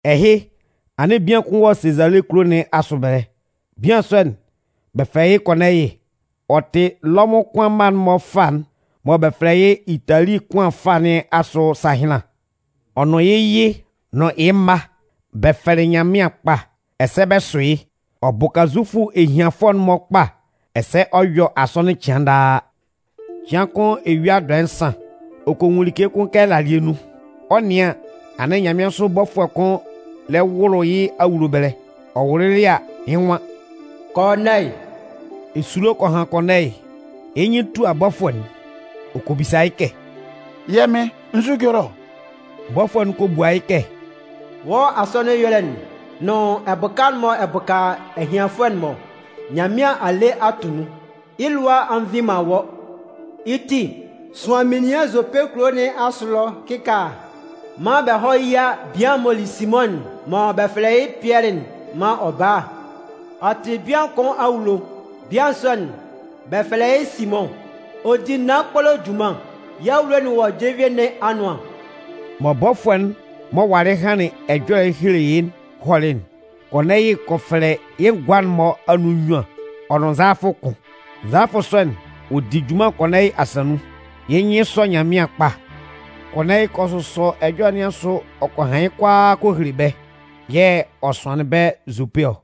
Ɛhɩ, anɩn bian kʋn wɔ Sezale kulo nɩn asʋ ɛbɛlɛ. Bian sɔ'n, bɛ fɛlɛ yɩ́ Kɔɔnɛyɩ. Ɔ tɩ Lɔmʋn kʋan mma'n-mɔ fâ'n mɔ bɛ fɛlɛ yɩ́ “Itali kʋan fâ” nɩn asʋ sahɩnlan. Ɔ nʋn yɩ́ yɩ nʋn yɩ́ mma, bɛ fɛlɩ Nyanmɩan kpa, ɛsɛ bɛ sʋ yɩ́. Ɔ bʋka Zufʋ ehianfʋɛ'n-mɔ kpa ɛsɛ ɔ yɔ asɔnɩn cɩan daa. Cɩan kʋn eyua dɔɛ nsan, ɔ kɔ nwun like kʋn kɛ ɛlalɩɛ nun. Ɔ 'nɩan an, anɩn nyanmɩansʋ bɔfʋɛ'n kʋn lɛ wʋlʋ yɩ́ awulo ɛbɛlɛ. Ɔ wʋlʋlɩ a, yɩ́ nwan: “Kɔɔnɛyɩ!” Esulo kɔ han Kɔɔnɛyɩ, yɩ́ nyɩn tua bɔfʋɛ'n. Ɔ kɔ bisa yɩ́ kɛ: “Yɛ́ Mɩn, nzu ɛjɔlɛ ɔ?” Bɔfʋɛ'n kɔ bua yɩ́ kɛ: “Wɔ́ asɔnɩn ɛyɔlɛ'n nʋn ɛbʋka'n mɔ ɛ bʋka ehianfʋɛ'n-mɔ'n, Nyanmɩan a le a tʋ nun, yɩ́ lʋa a nvi man wɔ́. Yɩ́ ti, sʋan menian Zope kulo nɩn asʋ ɛlɔ kɩkaala maan bɛ hɔ́ yía bian'n m'ɔ li Simʋn mɔ bɛ fɛlɛ yɩ́ Pɩɛlɩ'n maan ɔ bála. Ɔ tɩ bian kʋn awulo. Bian sɔ'n, bɛ fɛlɛ yɩ́ Simʋn, ɔ di naan kpolo junman. Yɩ́ awulo'n wɔ jenvie nɩn anʋan.” Mɔ bɔfʋɛ'n m'ɔ walɩ hanlɩn ɛjɔlɛ'n helelɩ yɩ́'n hɔlɩ'n, Kɔɔnɛyɩ kɔ fɛlɛ yɩ́ ngʋa'n-mɔ anun nnyuan ɔ nʋn nzalafʋ kʋn. Nzalafʋ sɔ'n, ɔ di junman Kɔɔnɛyɩ asa nun. Yɩ́ nyɩn sɔ Nyanmɩan kpa. Kɔɔnɛyɩ kɔ sʋsɔ ɛjɔlɛ nɩn asʋ ɔ kɔ han yɩ́ kʋalaa kɔ hele bɛ́, yɛ̂ ɔ sʋanlɩn bɛ́ Zope ɔ.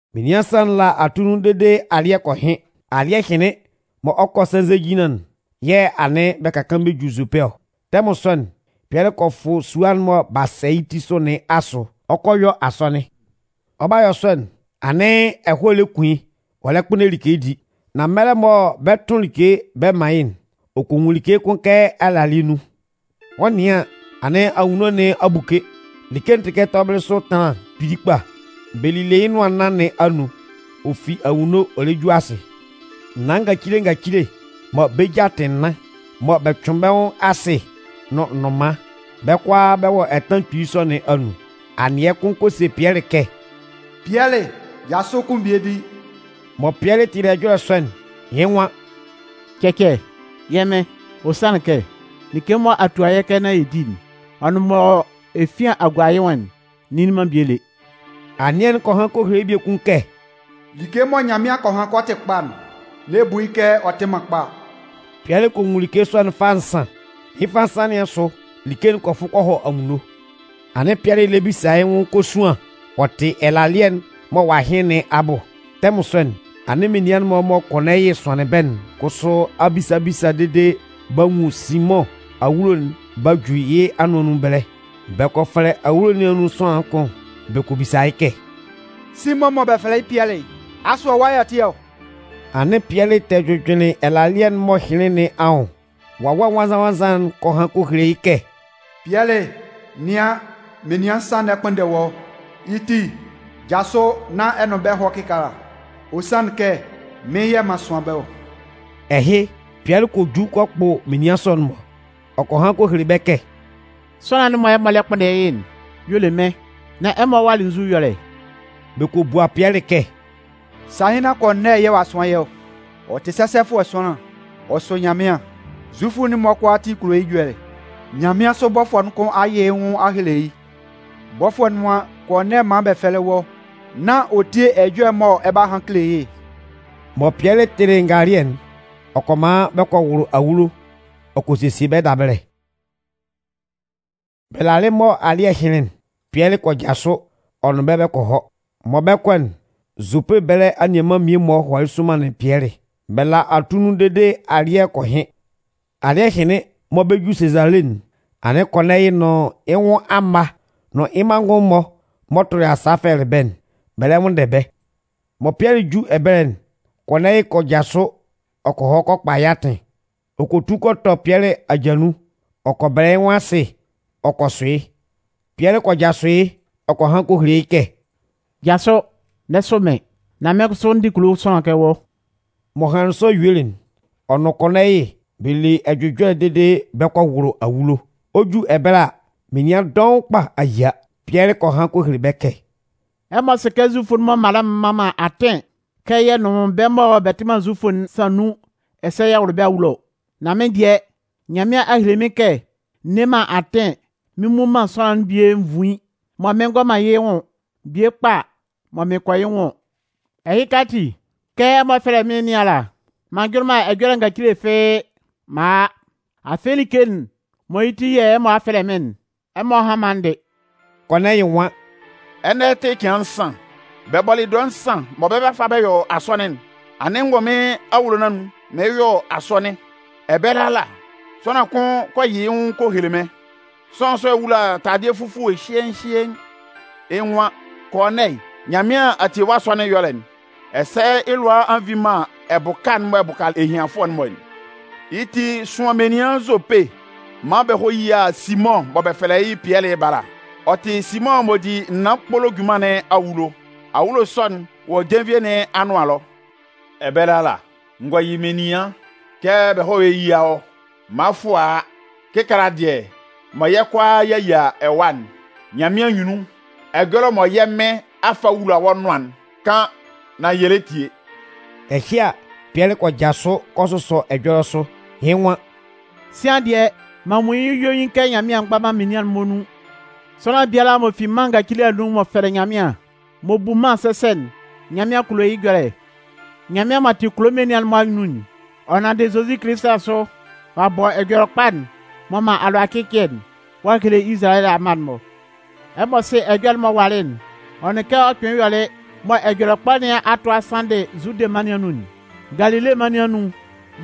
Menian nsan'n la atunnun dede alɩ́ɛ kɔ hɩn. Alɩ́ɛ hɩnlɩn mɔ ɔ 'kɔ sɛnzɛjinlan'n yɛ̂ anɩn bɛ ka kaan bɛ ju Zope ɔ. Tɛmʋn sɔ'n, Pɩɛlɩ kɔ fʋ sua'n mɔ b'a sɛ yɩ́ ti sʋ nɩn asʋ, ɔ 'kɔ a yɔ asɔnɩn. Ɔ 'ba yɔ sɔ'n, anɩn ɛhɔɛ lɛ kun yɩ́, ɔ lɛ kpʋnndɛ like di. Nan mɛlɛ mɔ bɛ 'tʋn like bɛ man yɩ́'n, ɔ kɔ nwun like kʋn kɛ ɛlalɩɛ nun. Ɔ 'nɩan an, anɩn anwunno nɩn a buke. Like'n tɩ kɛ tɔbɩlɩ sʋ ɛtanlan kpili kpa. Bɛ lile yɩ́ nʋan nna nɩn anun, ɔ fi anwunno ɔ lɛ ju asɩ. Naan ngacile ngacile, mɔ bɛ́ ja tɩ nnan, mɔ bɛ cʋɩn bɛ́ nwʋn asɩ nʋn nnʋnman, bɛ́ kʋalaa bɛ wɔ ɛtanlan kpili sɔ nɩn anun. Anɩɛ kʋn kɔ se Pɩɛlɩ kɛ: “Pɩɛlɩ, jasʋ kun bie di!” Mɔ Pɩɛlɩ tɩlɩ ɛjɔlɛ sɔ'n, yɩ́ nwan: “Cɛcɛ, yɛ́ Mɩn. Ɔ sanlɩn kɛ, like mɔ a tua yɛ́ kɛ nán yɛ di, ɔ nʋn mɔ efian a gua yɩ́ nwʋn'n, n nnili man bie lé.” Anɩɛ'n kɔ han kɔ hele yɩ́ biekun kɛ: “Like mɔ Nyanmɩan kɔ han kɛ ɔ tɩ kpa'n, n'ɛ bu yɩ́ kɛ ɔ tɩ man kpa.” Pɩɛlɩ kɔ nwun like sɔ'n fâ nsan. Yɩ́ fâ nsan nɩn asʋ, like'n kɔ fʋ kɔ hɔ anwunno. Anɩn Pɩɛlɩ lɛ bisa yɩ́ nwʋn kosuan ɔ tɩ ɛlalɩɛ'n mɔ ɔ'a hɩn nɩn abʋ. Tɛmʋn sɔ'n, anɩn menian'n-mɔ mɔ Kɔɔnɛyɩ sʋanlɩn bɛ́'n kʋsʋ a bisa bisa dede b'a nwun Simʋn awulo'n b'a ju yɩ́ anʋan nun ɛbɛlɛ. Bɛ kɔ fɛlɛ awulo nɩn anun sʋanlan'n kʋn bɛ kɔ bisa yɩ́ kɛ: “Simʋn mɔ bɛ fɛlɛ yɩ́ Pɩɛlɩ'n, asʋ ɛwa y'ɔ tɩ ɔ?” Anɩn Pɩɛlɩ tɛ jʋjʋnlɩn ɛlalɩɛ'n m'ɔ hɩnlɩn nɩn anwʋn, Wawɛ Nwannzan-nwannzan'n kɔ han kɔ hele yɩ́ kɛ: “Pɩɛlɩ, nɩan, menian nsan lɛ kpʋnndɛ wɔ́. Yɩ́ ti, jasʋ nán ɛ nʋn bɛ́ hɔ́ kɩkaala. Ɔ sanlɩn kɛ, mɩ́n yɛ̂ m'an sʋan bɛ́ ɔ.” Ɛhɩ, Pɩɛlɩ kɔ ju kɔ kpʋ menian sɔ'n-mɔ. Ɔ kɔ han kɔ hele bɛ́ kɛ: “Sʋanlan'n mɔ ɛmɔ lɛ kpʋnndɛ yɩ́'n y'ɔ le mɩ́n. Nan ɛmɔ walɩ nzʋ ɛyɔlɛ?” Bɛ kɔ bua Pɩɛlɩ kɛ: “Sahɩnlan Kɔɔnɛyɩ yɛ̂ ɔ'a sʋan yɛ́ ɔ. Ɔ tɩ sɛsɛfʋɛ sʋanlan, ɔ sʋ Nyanmɩan. Zufʋ'n-mɔ kʋalaatin kulo yɩ́ ɛjɔlɛ. Nyanmɩansʋ bɔfʋɛ'n kʋn a yɩ yɩ́ nwʋn a hele yɩ́. Bɔfʋɛ'n nwan Kɔɔnɛyɩ mán bɛ fɛ́lɛ wɔ́ nán ɔ tíe ɛjɔlɛ'n mɔ ɛ 'ba han kele yɩ́'n.” Mɔ Pɩɛlɩ tɩlɩ ngalɩɛ'n, ɔ kɔ man bɛ kɔ wʋlʋ awulo ɔ kɔ sesie bɛ́ dabɛlɛ. Bɛ lalɩ mɔ alɩ́ɛ hɩnlɩn'n, Pɩɛlɩ kɔ jasʋ ɔ nʋn bɛ́ bɛ kɔ hɔ. Mɔ bɛ 'kɔ'n, Zope ɛbɛlɛ anianman'n mmie-mɔ hɔlɩ somanlɩn Pɩɛlɩ. Bɛ la atunnun dede alɩ́ɛ kɔ hɩn. Alɩ́ɛ hɩnlɩn mɔ bɛ 'ju Sezale'n, anɩn Kɔɔnɛyɩ nʋn yɩ́ nwʋn amma nʋn yɩ́ manngʋn'n-mɔ m'ɔ tʋlɩ yɩ́ sa fɛlɛlɩ bɛ́'n, bɛ lɛ nwʋnndɛ bɛ́. Mɔ Pɩɛlɩ 'ju ɛbɛlɛ'n, Kɔɔnɛyɩ kɔ jasʋ ɔ kɔ hɔ kɔ kpa yɩ́ atɩn. Ɔ kɔ tu kɔ tɔ Pɩɛlɩ aja nun ɔ kɔ bɛlɛ yɩ́ nwʋn asɩ ɔ kɔ sʋ yɩ́. Pɩɛlɩ kɔ jasʋ yɩ́ ɔ kɔ han kɔ hele yɩ́ kɛ: “Jasʋ, n'ɛ sʋ mɩ́n, nán mɩ́n kʋsʋ, n dɩ kulo sʋanlan kɛ wɔ́.” M'ɔ hanlɩn sɔ yuelɩ'n, ɔ nʋn Kɔɔnɛyɩ bɛ le ɛjʋjɔlɛ dede bɛ kɔ wʋlʋ awulo. Ɔ 'ju ɛbɛlɛ a, menian dɔʋn kpa a yia. Pɩɛlɩ kɔ han kɔ hele bɛ́ kɛ: “Ɛmɔ sɩ kɛ Zufʋ'n-mɔ mala'n mman man yɛ́ atɩn kɛ yɛ nʋn bɛ́ mɔ bɛ tɩ man Zufʋ'n sán nun ɛsɛ yɛ wʋ́lʋ bɛ́ awulo. Nan mɩ́n dɩɛ, Nyanmɩan a hele mɩ́n kɛ n nne man atɩn mɩn mmun man sʋanlan'n bie nvuin mɔ bɛ ngɔ man yɩ́ nwʋn, bie kpa mɔ bɛ kɔ yɩ́ nwʋn ɔ. Ɛhɩka ati, kɛ ɛmɔ fɛlɛlɩ mɩ́n nɩn ala, m'an njʋnlɩn man ɛjɔlɛ ngacile fɩ́ɩ́, m'an a a. Afɩ Like'n mɔ yɩ́ ti yɛ̂ ɛmɔ a fɛlɛ mɩ́n'n, ɛmɔ hán maan n dɩ́.” Kɔɔnɛyɩ nwan: “Ɛnɛ tɩ cɩan nsan, bɛ bɔlɩ dɔɛ nsan mɔ bɛ 'fa bɛ yɔ asɔnɩn'n, anɩn n wɔ mɩ́n awulo mɩɩn yɔ asɔnɩn. Ɛbɛlɛ ala, sʋanlan kʋn kɔ yɩ yɩ́ nwʋn kɔ hele mɩ́n. Sʋanlan sɔ'n wula taladɩɛ fufue hyɩɛɩn hyɩɛɩn. Yɩ́ nwan: ‘Kɔɔnɛyɩ, Nyanmɩan a tie wɔ́ asɔnɩn ɛyɔlɛ'n, ɛsɛ yɩ́ lʋa a nvi man ɛbʋka'n mɔ ɛ bʋka ehianfʋɛ'n-mɔ'n. Yɩ́ ti, sʋan menian Zope maan bɛ hɔ́ yía Simʋn mɔ bɛ fɛlɛ yɩ́ Pɩɛlɩ'n bála. Ɔ tɩ Simʋn m'ɔ di naan kpolo junman nɩn awulo. Awulo sɔ'n wɔ jenvie nɩn anʋan ɛlɔ.’ Ɛbɛlɛ ala, n gɔ yɩ menian kɛ bɛ hɔ́ yía wɔ́. Mʋafʋɛ a a. Kɩkaala dɩɛ mɔ yɛ́ kʋalaa y'a yia ɛwa'n, Nyanmɩan anyunnun, ɛjɔlɛ mɔ yɛ́ Mɩn a fa a wula wɔ́ nʋan'n, kan nán yɛ lɛ tie.” Ɛhɩ a, Pɩɛlɩ kɔ jasʋ kɔ sʋsɔ ɛjɔlɛ sʋ. Yɩ́ nwan: “Sian dɩɛ, m'an nwun yɩ́ yuein kɛ Nyanmɩan mgba man menian'n-mɔ nun. Sʋanlan bia ala m'ɔ fi mân ngacile anun m'ɔ fɛlɩ Nyanmɩan, m'ɔ bu mân sɛsɛ'n, Nyanmɩan kulo yɩ́ ɛjɔlɛ. Nyanmɩan m'ɔ tɩ kulo menian'n-mɔ Amɩn'n, ɔ nanndɩ Zozi Kilisi asʋ ɔ'a bɔ Ɛjɔlɛkpa'n m'ɔ man alʋacɩcɩɛ'n ɔ'a hele Izalayɛ amma'n-mɔ. Ɛmɔ sɩ ɛjɔlɛ'n m'ɔ walɩ'n, ɔ nʋn kɛ ɔ kpɩnlɩn yɔlɩ mɔ Ɛjɔlɛkpa ɛhɩ a tʋ a sanndɩ Zude mân nɩn anun'n. Galile mân nɩn anun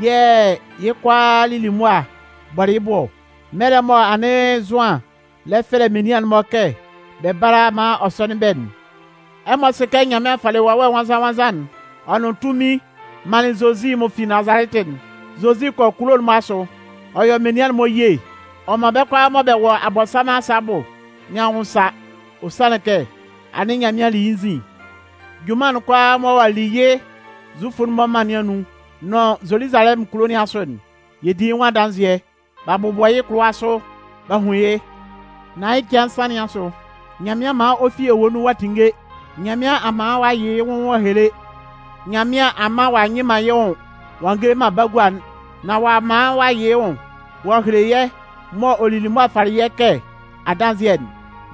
yɛ̂ yɩ́ kʋalaa lili mʋan bɔlɩ yɩ́ bʋ ɔ, mɛlɛ mɔ anɩn Zʋan lɛ fɛfɛlɛ menian'n-mɔ kɛ bɛ bála maan ɔ sɔ́nɩn bɛ́'n. Ɛmɔ sɩ kɛ Nyanmɩan falɩ Wawɛ Nwannzan-nwannzan'n ɔ nʋn tunmin ɔ manlɩn Zozi m'ɔ fi Nazalɛtɩ'n. Zozi kɔ kulo'n-mɔ asʋ. Ɔ yɔ menian'n-mɔ ye, ɔ man bɛ́ kʋalaa mɔ bɛ wɔ Abɔnsanmʋn asa abʋ nɩn anwʋn sa. Ɔ sanlɩn kɛ, anɩn Nyanmɩan li yɩ́ nzin. “Junman'n kʋalaa mɔ ɔ'a li yɩ́ Zufʋ'n-mɔ mân nɩn anun nʋn Zoluzalɛmʋn kulo nɩn asʋ'n, yɛ di yɩ́ nwʋn adanzɩɛ. B'a bʋbɔ yɩ́ kʋlʋwa sʋ b'a hun yɩ́. Nan yɩ́ cɩan nsan nɩn asʋ, Nyanmɩan man ɔ fi ewue nun ɔ a tinnge. Nyanmɩan a man ɔ'a yɩ yɩ́ nwʋn ɔ'a hele. Nyanmɩan a man ɔ'a nyɩ man yɩ́ nwʋn ɔ'a ngele man bagua'n. Nan ɔ'a man ɔ'a yɩ yɩ́ nwʋn ɔ'a hele yɛ́ mɔ ɔ lili mʋa falɩ yɛ́ kɛ adanzɩɛ'n.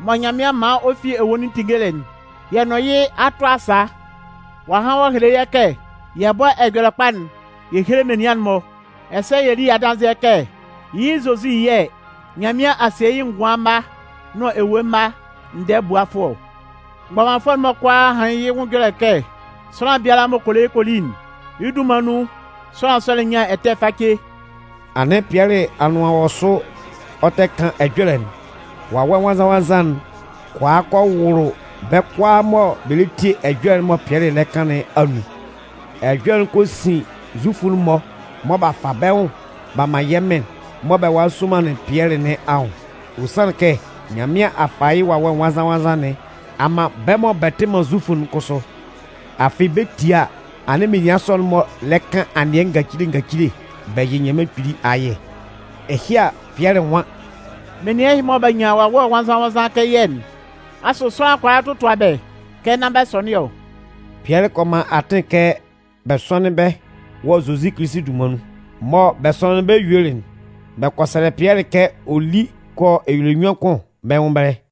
Mɔ Nyanmɩan man ɔ fi ewue nun tinngelɩ'n, yɛ nʋn yɩ́ a tʋ asa. Ɔ a han ɔ'a hele yɛ́ kɛ yɛ bɔ́ Ɛjɔlɛkpa'n yɛ héle menian'n-mɔ, ɛsɛ yɛ lí adanzɩɛ kɛ yɩ́ Zozi yɛ̂ Nyanmɩan a sie yɩ́ ngʋan mma nʋn ewue mma ndɛɛbuafʋɛ ɔ. Mgbɔmanfʋɛ'n-mɔ kʋalaa hanlɩn yɩ́ ɛjɔlɛ kɛ, sʋanlan biala m'ɔ kɔ le yɩ́ kɔ li'n, yɩ́ dunman nun, sʋanlan sɔ'n nyan ɛtɛ face.” Anɩn Pɩɛlɩ anʋan wɔ sʋ ɔ tɛ kan ɛjɔlɛ'n, Wawɛ Nwannzan-nwannzan'n kɔ a kɔ wʋlʋ bɛ́ kʋalaa mɔ bɛ lɛ tie ɛjɔlɛ'n mɔ Pɩɛlɩ lɛ kan nɩn anun. Ɛjɔlɛ'n kɔ sin Zufʋ'n-mɔ mɔ b'a fa bɛ́ nwʋn b'a man yɛ́ Mɩn mɔ bɛ walɩ sɔmanlɩn Pɩɛlɩ nɩn anwʋn. Ɔ sanlɩn kɛ Nyanmɩan a fa yɩ́ Wawɛ Nwannzan-nwannzan nɩn a man bɛ́ mɔ bɛ tɩ man Zufʋ'n kʋsʋ. Afɩ bɛ 'tie a, anɩn menian sɔ'n-mɔ lɛ kan anɩɛ ngacile ngacile bɛ yɩ Nyanmɩan Kpili ayɛ. Ɛhɩ a, Pɩɛlɩ nwan: “Menian ɛhɩ-mɔ mɔ b'a nyan Wawɛ Nwannzan-nwannzan'n kɛ yɛ́'n, asʋ sʋanlan kʋala totua bɛ́ kɛ nán bɛ sɔnɩn ɔ?” Pɩɛlɩ kɔ man atɩn kɛ bɛ sɔ́nɩn bɛ́ wɔ Zozi Kilisi dunman nun. Mɔ bɛ sɔnɩnlɩn bɛ́ yuelɩ'n, bɛ kɔ sɛlɛ Pɩɛlɩ kɛ ɔ lí kɔ yɔ ɛlɛnyuan kʋn bɛ́ nwʋn ɛbɛlɛ.